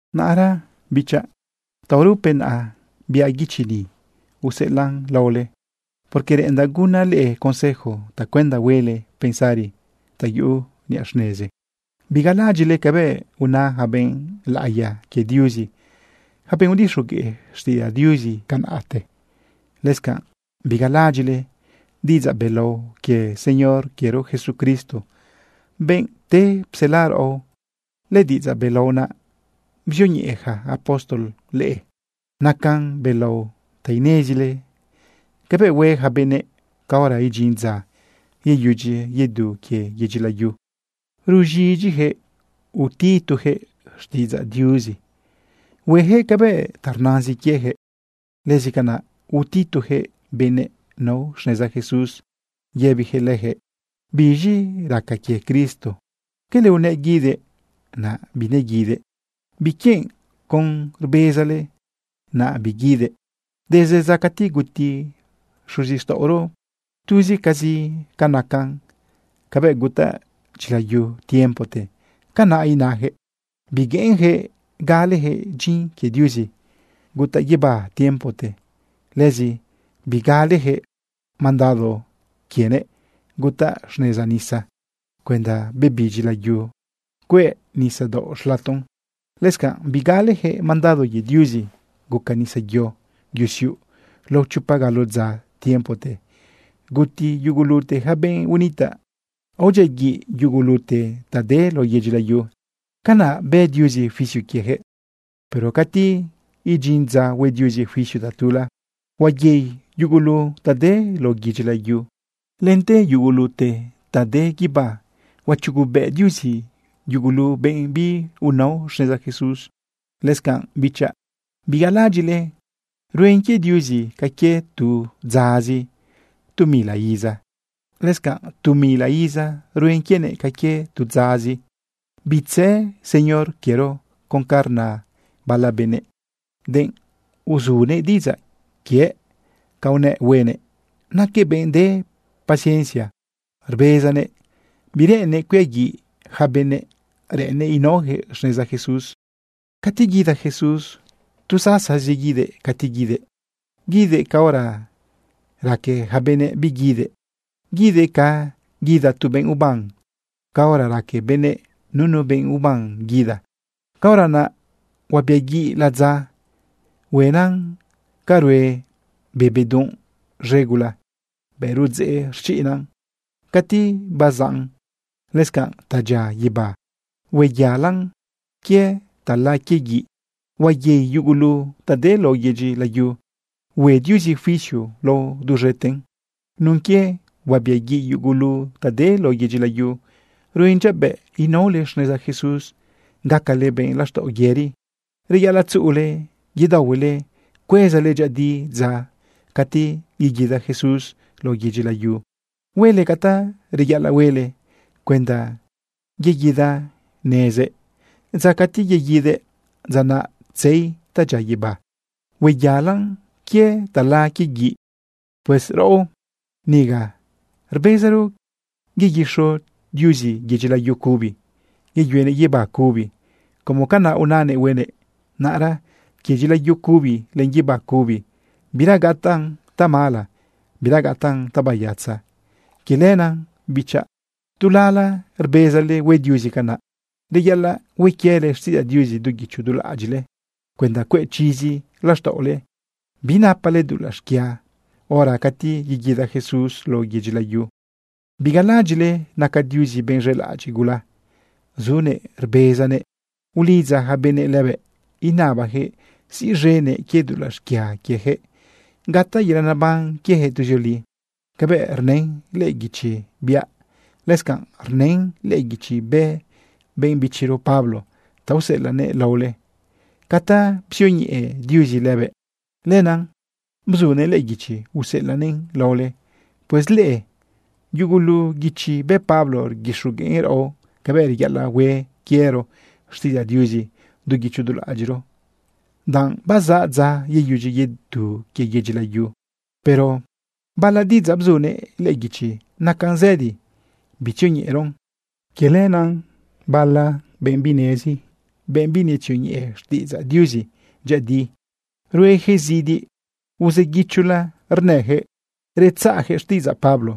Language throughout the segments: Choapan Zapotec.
Naꞌra bichaꞌ, taurupe naꞌ biaꞌ guichi ni useꞌelaꞌn laole, porque reꞌendaꞌ gunaꞌ leꞌe consejo tacuenda huele pensari ta yuꞌu niꞌa xnezi. Bigalaꞌadyiꞌle cabëꞌ una yaca benꞌ laꞌiya quie Diuzi, yaca benꞌ udixogueꞌ xtiꞌidzaꞌ Diuzi tiempote. Lëscanꞌ bigalaꞌadyiꞌle diꞌidzaꞌ belao quie Señor quiero Jesucristo, benꞌ pte psela raꞌo. Lëdiꞌidzaꞌ belao naꞌ bzioñeꞌe yaca apóstol leꞌe. Nacan belao ta inezile cabëꞌ hue yaca benëꞌ caora idyin dza yeyudyi yedu quie yedyi layu. Ruz̃idyijëꞌ utitujëꞌ xtiꞌidzaꞌ Diuzi. Huejëꞌ cabëꞌ ta rnazin quiejëꞌ. Lëscanaꞌ utitujëꞌ benëꞌ nao xneza Jesús yëbijëꞌ lëjëꞌ: “¿Biz̃i raca quie Cristo? ¿Quele unëꞌ guidëꞌ, naꞌ bineguidëꞌ? ¿Biquienꞌ con rbezale, naꞌ biguidëꞌ? Desde dza cati guti xuzixtaꞌoro, tuzicazi ca nacan cabëꞌ gutaꞌ dyilayu tiempote.” Canaꞌ inajëꞌ. Bigueꞌenjëꞌ galejëꞌ dyin quie Diuzi gutaꞌ guibá tiempote. Lëzi bigalejëꞌ mandado quienëꞌ gutaꞌ xneza nisa cuenda bebidyi layu cueꞌ nisadaoꞌ xlaton. Lëscanꞌ bigalejëꞌ mandado quie Diuzi guca nisayo yusiuꞌ lao chopa galo dza tiempote guti yugulute ja benꞌ unitaꞌ, aodyiaguiꞌ yugulute ta de lao yedyi layu. Canaꞌ bë Diuzi juicio quieyaquëꞌ. Pero cati idyin dza hue Diuzi juicio tatula, huayei yugulute ta de lao yedyi layu lente yugulute ta de guibá. Huachugubëꞌ Diuzi yugulu benꞌ biunao xneza Jesús. Lëscanꞌ, bichaꞌ, bigalaꞌadyiꞌle ruen quie Diuzi ca quie tu dzazi tu mila iza. Lëscanꞌ tu mila iza ruen quienëꞌ ca quie tu dzazi. Bitzë Señor quiero con ca rna bala benëꞌ, denꞌ uzunëꞌ diꞌidzaꞌ quiëꞌ ca unëꞌ huenëꞌ. Naquëꞌ benꞌ de paciencia rbezanëꞌ bireꞌennëꞌ cuiaguiꞌ yaca benëꞌ. Reꞌennëꞌ inaojëꞌ xneza Jesús. Cati guida Jesús, tu sasazi guidëꞌ cati guidëꞌ. Guidëꞌ caora raque yaca benëꞌ biguidëꞌ. Guidëꞌ ca guida tu benꞌ uban caora raque benëꞌ nunu benꞌ uban guida. Caora naꞌ huabiaguiꞌ ladza. Huenan ca rue be bedunꞌ z̃e gula bëꞌ rudzeꞌ rchiꞌnan cati bazaꞌn. Lëscanꞌ ta dyia guibá, hueyalan quie tala quie guiꞌ. Huayei yugulu ta de lao yedyi layu. Hue Diuzi juicio lao duz̃eten. Nun quie huabiaguiꞌ yugulu ta de lao yedyi layu, ruen dyabëꞌ inaole xneza Jesús gacale benꞌ laxtaꞌo yëri. Reyaꞌalaꞌ tzuꞌule yedaohuele cuezale dyëꞌëdi dza cati yeguida Jesús lao yedyi layu. Huele ca ta reyaꞌalaꞌ huele cuenda yeguidanezëꞌ. Dza cati yeguidëꞌ, dza naꞌ tzei ta dyia guibá, hueyalan quie tala quie guiꞌ. Pues raꞌo niga rbezaro yeguixo Diuzi yedyi layu cubi, yeyuenëꞌ guibá cubi como canaꞌ unanëꞌ huenëꞌ. Naꞌra quie dyilayu cubi len guibá cubi, bira gataꞌn tamala, bira gataꞌn tabayatza. Quie lenaꞌ bichaꞌ, tu lala rbezale hue Diuzi canaꞌ, reyaꞌalaꞌ hue quiele xtiꞌidzaꞌ Diuzi du guicho du laꞌadyiꞌle cuenda cueꞌ chizi laxtaꞌole binapale dulaꞌ xquia hora cati yeguida Jesús lao yedyi layu. Bigalaꞌadyiꞌle naca Diuzi benꞌ z̃elaꞌadyiꞌ gula. Zunëꞌ rbezanëꞌ ulidza ja benëꞌ lëbëꞌ inabajëꞌ siꞌz̃enëꞌ quie dulaꞌ xquia quiejëꞌ gataꞌ yelaꞌ naban quiejëꞌ tuzioli. Cabëꞌ rnën lëꞌë guichi biaꞌ, lëscanꞌrë rnën lëꞌë guichi bë benꞌ bichiro Pablo ta useꞌelaꞌnëꞌ laole. Ca ta bzioñeꞌe Diuzi lëbëꞌ, lenaꞌ bzunëꞌ lëꞌë guichi useꞌelaꞌnëꞌn laole. Pues lëꞌë yugulu guichi bë Pablo rguixogueꞌn raꞌo cabëꞌ reyaꞌalaꞌ hue quiero xtiꞌidzaꞌ Diuzi du guicho du laꞌadyiꞌro, danꞌ bazaꞌ dza yeyudyi yedu quie yedyi layu. Pero bala diꞌidzaꞌ bzunëꞌ lëꞌë guichi nacan zëdi bitzioñeꞌeron. Quie lenaꞌ bala benꞌ binezi, benꞌ binetzioñeꞌe xtiꞌidzaꞌ Diuzi dyëꞌëdi, rueyaquëꞌ zidi uzëguichola rnëjëꞌ retzaꞌyaquëꞌ xtiꞌidzaꞌ Pablo.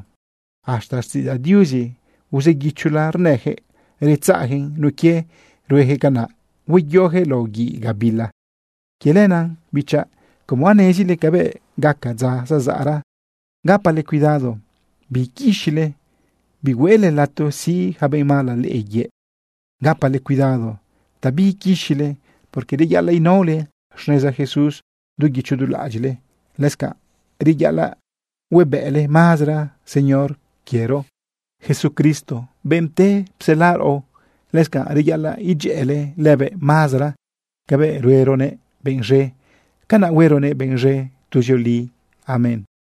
Hasta xtiꞌidzaꞌ Diuzi uzëguichola rnëjëꞌ retzaꞌyaquëꞌn. Nun quie ruejëꞌ canaꞌ, huayojëꞌ lao guiꞌ gabila. Quie lenaꞌ, bichaꞌ, como anezile cabëꞌ gaca dza zazaꞌra, gapale cuidado biiquixile bihueꞌle lato siꞌ yaca benꞌ mala leꞌe yëꞌ. Gapale cuidado ta biiquixile, porque reyaꞌalaꞌ inaole xneza Jesús du guicho du laꞌadyiꞌle. Lëscanꞌ reyaꞌalaꞌ huebëꞌle mazara Señor quiero Jesucristo, benꞌ pte psela raꞌo. Lëscanꞌ reyaꞌalaꞌ idyëꞌële lëbëꞌ mazara. Cabëꞌ rueronëꞌ benꞌ z̃e, canaꞌ hueronëꞌ benꞌ z̃e tuzioli. Amén.